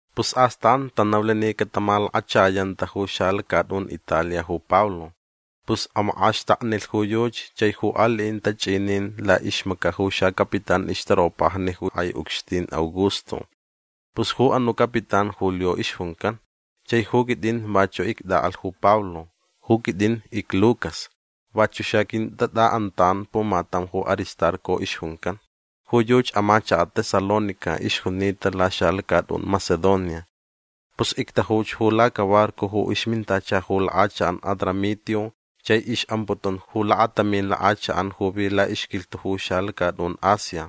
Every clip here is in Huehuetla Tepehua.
Pus astan tanaulh ni catamalakachayanta ju xalacatʼun Italia ju Pablo. Pus amakʼaxtaknilh ju yuchi chai ju aliʼin tachʼinin laʼixmacaʼ ju xacapitán ixtaropajni ju kʼai ucxtin Augusto. Pus ju anuʼ capitán Julio ixjuncan. Chai ju quitʼin vachuʼ ictʼaʼalh ju Pablo. Ju quitʼin icLucas. Vachuʼ xaquintatʼaʼantan pumatam ju Aristarco ixjuncan. Ju yuchi amachakaʼ Tesalónica ixjunita laxalacatʼun Macedonia. Pus ictajuch ju lacabarco ju ixmintacha ju lakʼachakʼan Adramitio chai ixʼamputun ju lakatamin lakʼachakʼan ju vi laʼixquilhtuʼ ju xalacatʼun Asia.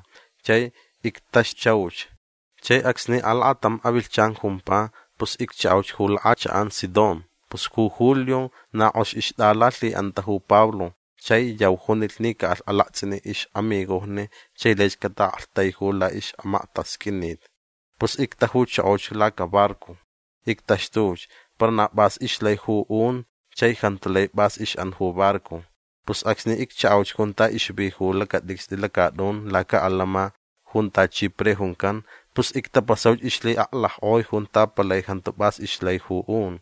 Chai ictaxtuchauch. Chai acsni alakatam avilhchan jumpa pus icchaʼauch ju lakʼachakʼan Sidón. Pus ju Julio na kʼox ixtʼalalhiʼanta ju Pablo chai yau junilh ni caʼalh alaktsʼiniʼ ixʼamigojni chai laich cataʼaktaiju laʼixmaktasqʼuinit. Pus ictajuchokoch lacabarco. Ictaxtuch. Para na pʼas ixlai ju un chai jantu lai pʼas ixʼan ju barco. Pus acsni icchaʼauch junta ixvi ju lacatʼicstʼi lacatʼun lacaʼalama junta Chipre juncan pus ictapasauch ixlhiʼaclackʼoi junta palai jantu pʼas ixlai ju un.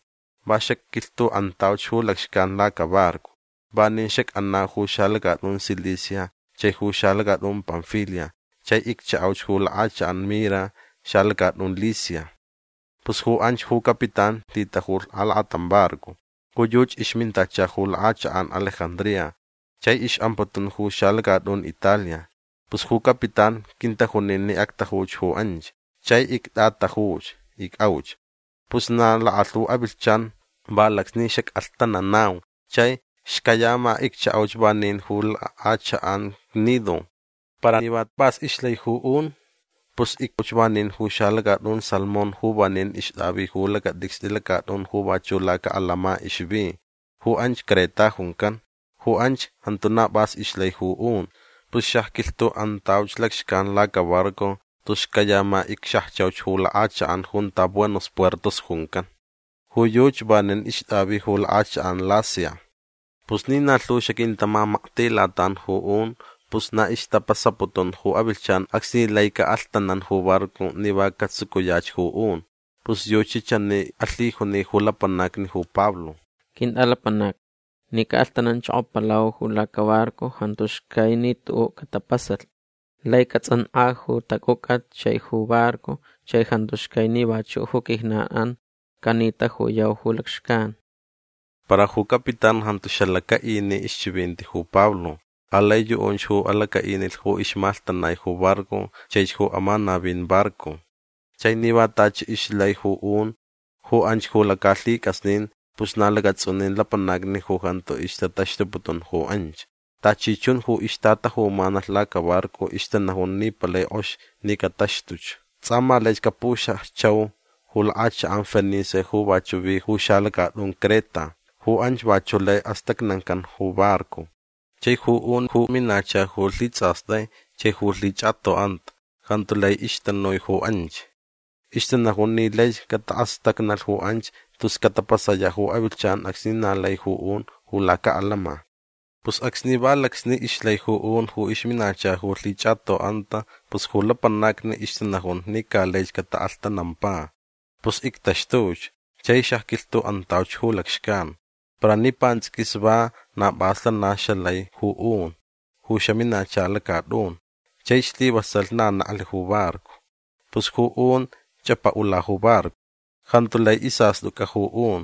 Va xacquilhtuʼantauch ju lacxcan lacabarco. Vanin xacʼanau ju xalacatʼun Cilicia chai ju xalacatʼun Panfilia chai icchaʼauch ju lakʼachakʼan Mira xalacatʼun Licia. Pus ju anch ju capitán lhitajulh alakatam barco. Ju yuchi ixmintacha ju lakʼachakʼan Alejandría chai ixʼamputun ju xalacatʼun Italia. Pus ju capitán quintajunin ni actajuch ju anch. Chai ictʼatajuch. Icʼauch. Pus na lakalhu avilhchan va lacsni xacʼalhtananau chai xcayama icchaʼauch vanin ju lakʼachakʼan Gnido. Para ni na pʼas ixlai ju un pus icpuʼauch vanin ju xalacatʼun Salmón ju vanin ixtʼavi ju lacatʼicstʼi lacatʼun ju vachuʼ lacaʼalama ixvi. Ju anch Creta juncan. Ju anch jantu na pʼas ixlai ju un. Pus xacquilhtuʼantauch lacxcan lacabarco tus xcayama icxajchauch ju lakʼachakʼan junta Buenos Puertos juncan. Ju yuchi vanin ixtʼavi ju lakʼachakʼan Lasea. Pus ni na lhu xaquintamamaktilatan ju un pus na ixtapasaputun ju avilhchan acsni laicaʼ alhtanan ju barco ni va catsucuyach ju un. Pus yuchi chani alhijuni ju lapanacni ju Pablo: ―Quintʼalapanacni ni caʼalhtananchokopalau ju lacabarco jantu xcai ni tuʼuʼ catapasalh. Laich catsʼankʼa ju tacʼucʼat chai ju barco chai jantu xcai ni vachuʼ ju quijnanʼan canitajuyau ju lacxcan. Para ju capitán jantu xalacaʼini ixchivinti ju Pablo. Alai yuʼunch ju alacaʼinilh ju ixmalhtanai ju barco chaich ju amanavin barco. Chai ni va tachi ixlai ju un ju anch ju lacalhicʼasnin pus na lacatsʼunin lapanacni ju jantu ixtataxtuputun ju anch. Tachi chun ju ixtatajumanalh lacabarco ixtanajun ni palai kʼox ni cataxtuch. Tsʼa ma laich capuxajchau ju lakʼachakʼan Fenice ju vachuʼ vi ju xalacatʼun Creta. Ju anch vachuʼ lai astacnancan ju barco. Chai ju un ju minacha ju lhitsʼastai chai ju lhichʼatoʼanta jantu lai ixtanui ju anch. Ixtanajun ni laich cataʼastacnalh ju anch tus catapasayaʼ ju avilhchan acsni na lai ju un ju lacaʼalama. Pus acsni va lacsni ixlai ju un ju ixminacha ju lhichʼatoʼanta pus ju lapanacni ixtanajun ni ca laich cataʼalhtanampa. Pus ictaxtuch chai xacquilhtuʼantauch ju lacxcan. Para ni pantsʼiquis va na pʼas lana xalai ju un ju xaminacha lacatʼun. Chai slivasalh na neklh ju barco. Pus ju un chʼapaʼula ju barco. Jantu lai isastʼucʼa ju un.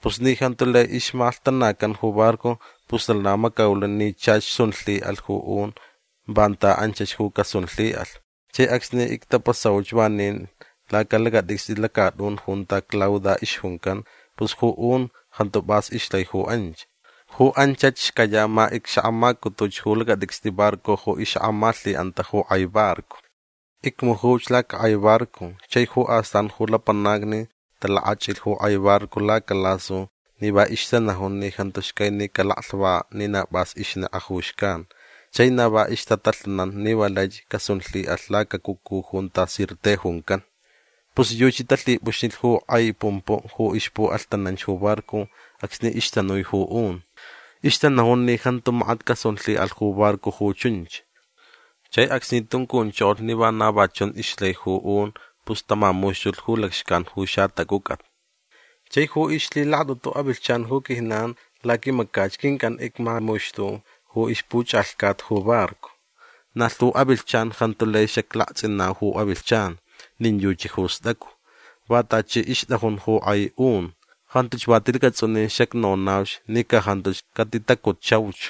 Pus ni jantu lai ixmalhtanacan ju barco pus lana macaulh ni chach sun lhiʼalh ju un vanta anchach ju casunlhiʼalh. Chai acsni ictapasauch vanin lacalacatʼicstʼi lacatʼun junta Clauda ixjuncan pus ju un jantu pʼas ixlai ju anch. Ju anchach xcayama icxakʼamacutuch ju lacatʼicstʼi barco ju ixakʼamalhiʼanta ju kʼai barco. Icmujuch lacakʼai barco chai ju astan ju lapanacni talakachʼilh ju kʼai barco lacalasu ni va ixtanajun ni jantu xcai ni calaclhvakaʼ ni na pʼas ixnekʼa ju xcan. Chai na va ixtatalhanan ni va laich casunlhiʼalh lacacucu junta Sirte juncan. Pus yuchi talhipʼuxnilh ju kʼai pumpuʼ ju ixpuʼalhtananch ju barco acsni ixtanui ju un. Ixtanajun ni jantu makat casunlhiʼalh ju barco ju chunch. Chai acsni tuncunchokolh ni vana va chun ixlai ju un pus tamamuxtulh ju lacxcan ju xatacʼucʼat. Chai ju ixlhilakatʼutu avilhchan ju quijnan laquimacach quincʼan icmamuxtu ju ixpuchʼalhcat ju barco. Na lhu avilhchan jantu lai xaclaktsʼinau ju avilhchan nin yuchi ju stʼacu. Va tachi ixtʼajun ju kʼai un. Jantuch va tilacatsʼunin xacnonauch ni ca jantuch catitacutchauch.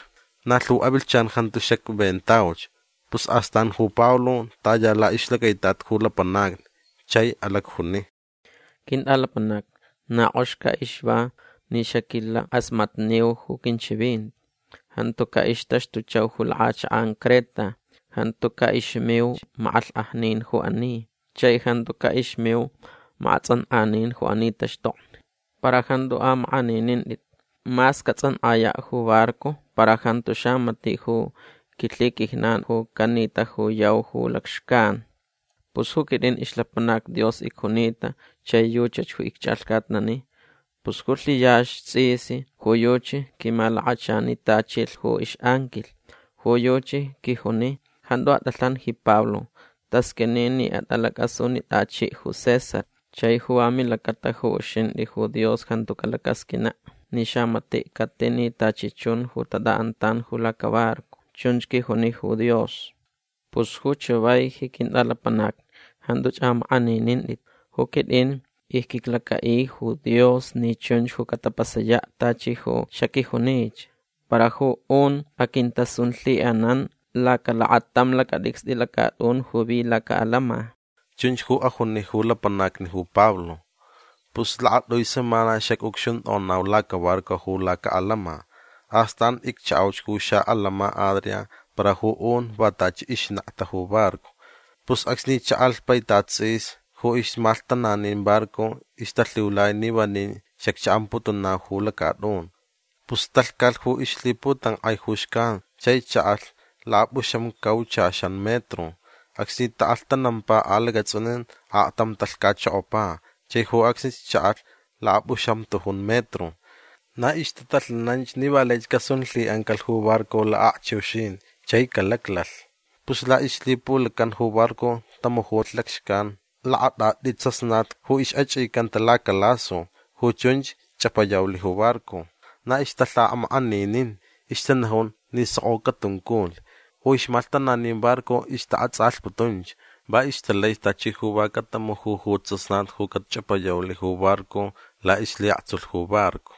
Na lhu avilhchan jantu xacventauch. Pus astan ju Pablo taya laʼixlacaitat ju lapanacni chai alacjuni: ―Quintʼalapanacni na kʼox ca ixva ni xaquilakʼasmatniu ju quinchivinti. Jantu caʼixtaxtuchauch ju lakʼachakʼan Creta. Jantu caʼixmiuch makʼalhkʼajnin ju ani. Chai jantu caʼixmiu makʼatsʼankʼanin ju ani taxtokni. Para jantu amakʼaninintʼit. Mas catsʼankʼayaʼ ju barco para jantu xamatiʼ ju quilhiquijnan ju canitajuyau ju lacxcan. Pus ju quitʼin ixlapanac Dios icjunita chai yuchach ju icchʼalhcatnani. Pus ju lhiyaxch tsʼis ju yuchi quimalakachanitachilh ju ixʼanquilh. Ju yuchi quijuni: “Jantu atʼalhan ji Pablo. Tasqʼuini ni atʼalacʼasunitʼachiʼ ju César. Chai ju va milacata ju uxintʼi ju Dios jantu calacasqʼuinaʼ ni xamatiʼ catini tachi chun ju tatʼaʼantan ju lacabarco”. Chunch quijuni ju Dios. Pus ju chavai ji quintʼalapanacni jantuch amakʼaninintʼit. Ju quitʼin icquiclacaʼi ju Dios ni chunch ju catapasayaʼ tachi ju xaquijunich. Para ju un sun aquintalhiʼanan lacalakatam lacatʼicstʼi lacatʼun ju vi lacaʼalama. ―Chunch ju ajuni ju lapanacni ju Pablo. Pus lakatʼui semana xacʼucxuntʼonau lacabarco ju lacaʼalama. Astan icchaʼauch ju xaʼalama Adria para ju un va tachi ixnekta ju barco. Pus acsni chaʼalh paitat tsʼis ju ixmalhtananin barco ixtalhiulai ni vanin xacchaʼamputunau ju lacatʼun. Pus talhcalh ju ixlhiputankʼai ju xcan chai chaʼalh lakapʼuxamcauchaxan metro. Acsni taʼalhtanampa alacatsʼunin aktam talhcachokopa chai ju acsnich chaʼalh lakapʼuxamtujun metro. Na ixtatalhananch ni va laich casunlhiʼancalh ju barco lakʼakchiuxin chai calaclalh. Pus laʼixlhipulacan ju barco tamujulh lacxcan lakatʼatʼi tsasnat ju ixʼachʼicanta lacalasu. Ju chunch chʼapayaulh ju barco. Na ixtalhamakʼaninin. Ixtanajun ni sokʼo catunculh. Ju ixmalhtananin barco ixtaʼatsʼalhputunch. Va ixtalaich tachi ju va catamuju ju tsasnat ju cachʼapayaulh ju barco laʼixlhiʼaktsulh ju barco.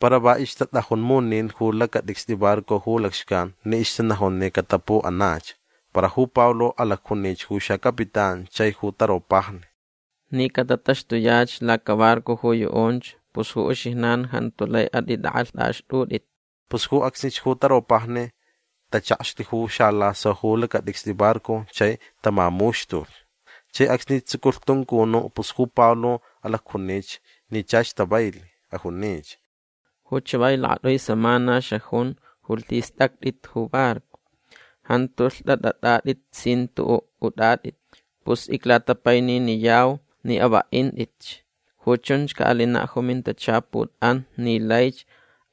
Para va ixtatʼajun munin ju lacatʼicstʼi barco ju lacxcan ni ixtanajun ni catapuʼanach. Para ju Pablo alacjunich ju xacapitán chai ju taropajni: ―Ni catataxtuyach lacabarco ju yuʼunch pus ju uxijnan jantu lai atʼitʼakʼalhtʼaxtʼutʼit. Pus ju acsnich ju taropajni tachakxlh ju xalaso ju lacatʼicstʼi barco chai tamamuxtulh. Chai acsni tsuculh tuncunuʼ pus ju Pablo alacjunich ni chach tavailh. Ajunich: ―Ju chavai lakatʼui semana xajun ju lhistʼactʼit ju barco. Jantu lhtʼatʼatʼatʼit sin tuʼuʼ utʼatʼit. Pus iclatapaininiyau ni avaʼintʼitch. Ju chunch caʼalinaʼ ju mintachaputʼan ni laich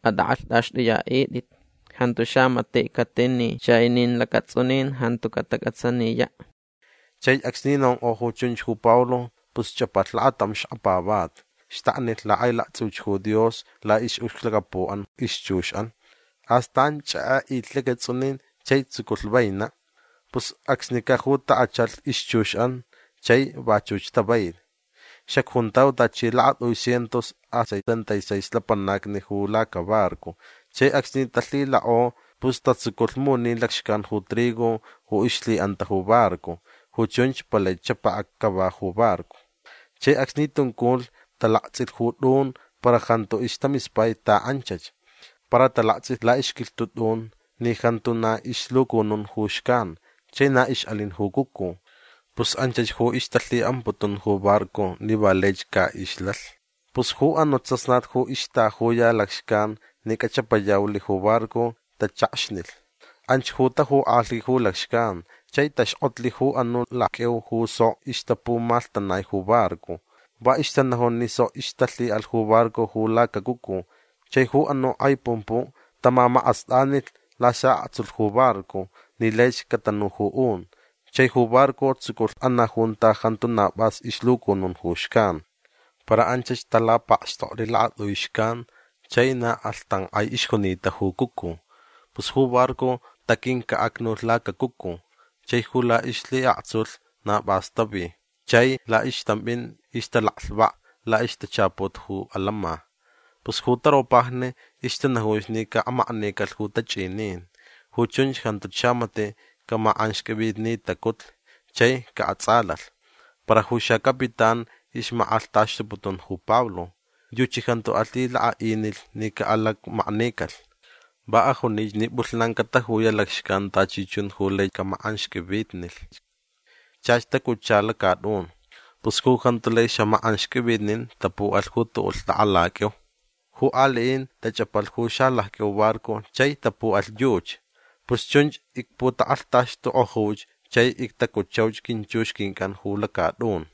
atʼakʼalhtʼaxtʼuyaʼitʼit. Jantu xamatiʼ catini chai nin lacatsʼunin jantu catacʼatsaniyaʼ. Chai acsni nonkʼo ju chunch ju Pablo pus chʼapalh lakatam xkapavati. Xtaknilh lakʼailaktsʼiuch ju Dios laʼixʼucxlacapuʼan ixchuxʼan. Astan chʼekʼeʼilh lacatsʼunin chai tsuculh vainaʼ. Pus acsnicaʼ ju takʼachalh ixchuxʼan chai vachuch tavailh. Xacjuntau tachi lakatʼui cientos a setenta y seis lapanacni ju lacabarco. Chai acsni talhilakʼo pus tatsuculh munin lacxcan ju trigo ju ixlhiʼanta ju barco. Ju chunch palai chapakʼa cava ju barco. Chai acsni tunculh talaktsʼilh ju tʼun para jantu istamispai taʼanchach. Para talaktsʼilh laʼixquilhtuʼ tʼun ni jantu na ixlucunun ju xcan chai na ixʼalin ju cucu. Pus anchach ju ixtalhiʼamputun ju barco ni va laich caʼixlalh. Pus ju anuʼ tsasnat ju ixtajuya lacxcan ni cachʼapayaulh ju barco tachakxnilh. Anch ju tajukʼalhi ju lacxcan. Chai taxkʼotlh ju anuʼ lacqʼuiu ju sok ixtapumalhtanai ju barco. Va ixtanajun ni sok ixtalhiʼalh ju barco ju lacacucu. Chai ju anuʼ kʼai pumpuʼ tamamakʼastʼanilh lasaʼaktsulh ju barco ni laich catanu ju un. Chai ju barco tsuculh anaʼ junta jantu na pʼas ixlucunun ju xcan. Para anchach talapakxtoklh lakatʼui xcan chai na kʼalhtankʼai ixjunita ju cucu. Pus ju barco taquincaʼacnulh lacacucu. Chai ju laʼixlhiʼaktsulh na pʼas tavi chai laʼixtampʼin ixtalaklhvak laʼixtachaput ju alama. Pus ju taropajni ixtanajunch ni caʼamaknicalh ju tachʼinin. Ju chunch jantuch xamatiʼ camakʼanxqʼuivitnitacutlh chai caʼatsʼalalh. Para ju xacapitán ixmakʼalhtaxtuputun ju Pablo. Yuchi jantu alhilakaʼinilh ni caʼalakmaknicalh. Va ajunich ni pʼulhnan catajuyaʼ lacxcan tachi chun ju lai camakʼanxqʼuivitnilhch. Chach tacutcha lacatʼun. Pus ju jantu lai xamakʼanxqʼuivitnin tapuʼalh ju tuʼuʼ lhtʼakʼalaqʼuiu. Ju aliʼin tachʼapalh ju xalacqʼuiu barco chai tapuʼalh yuchi. Pus chunch icputakʼalhtaxtukʼojuch chai ictacutchauch quinchux quincʼan ju lacatʼun.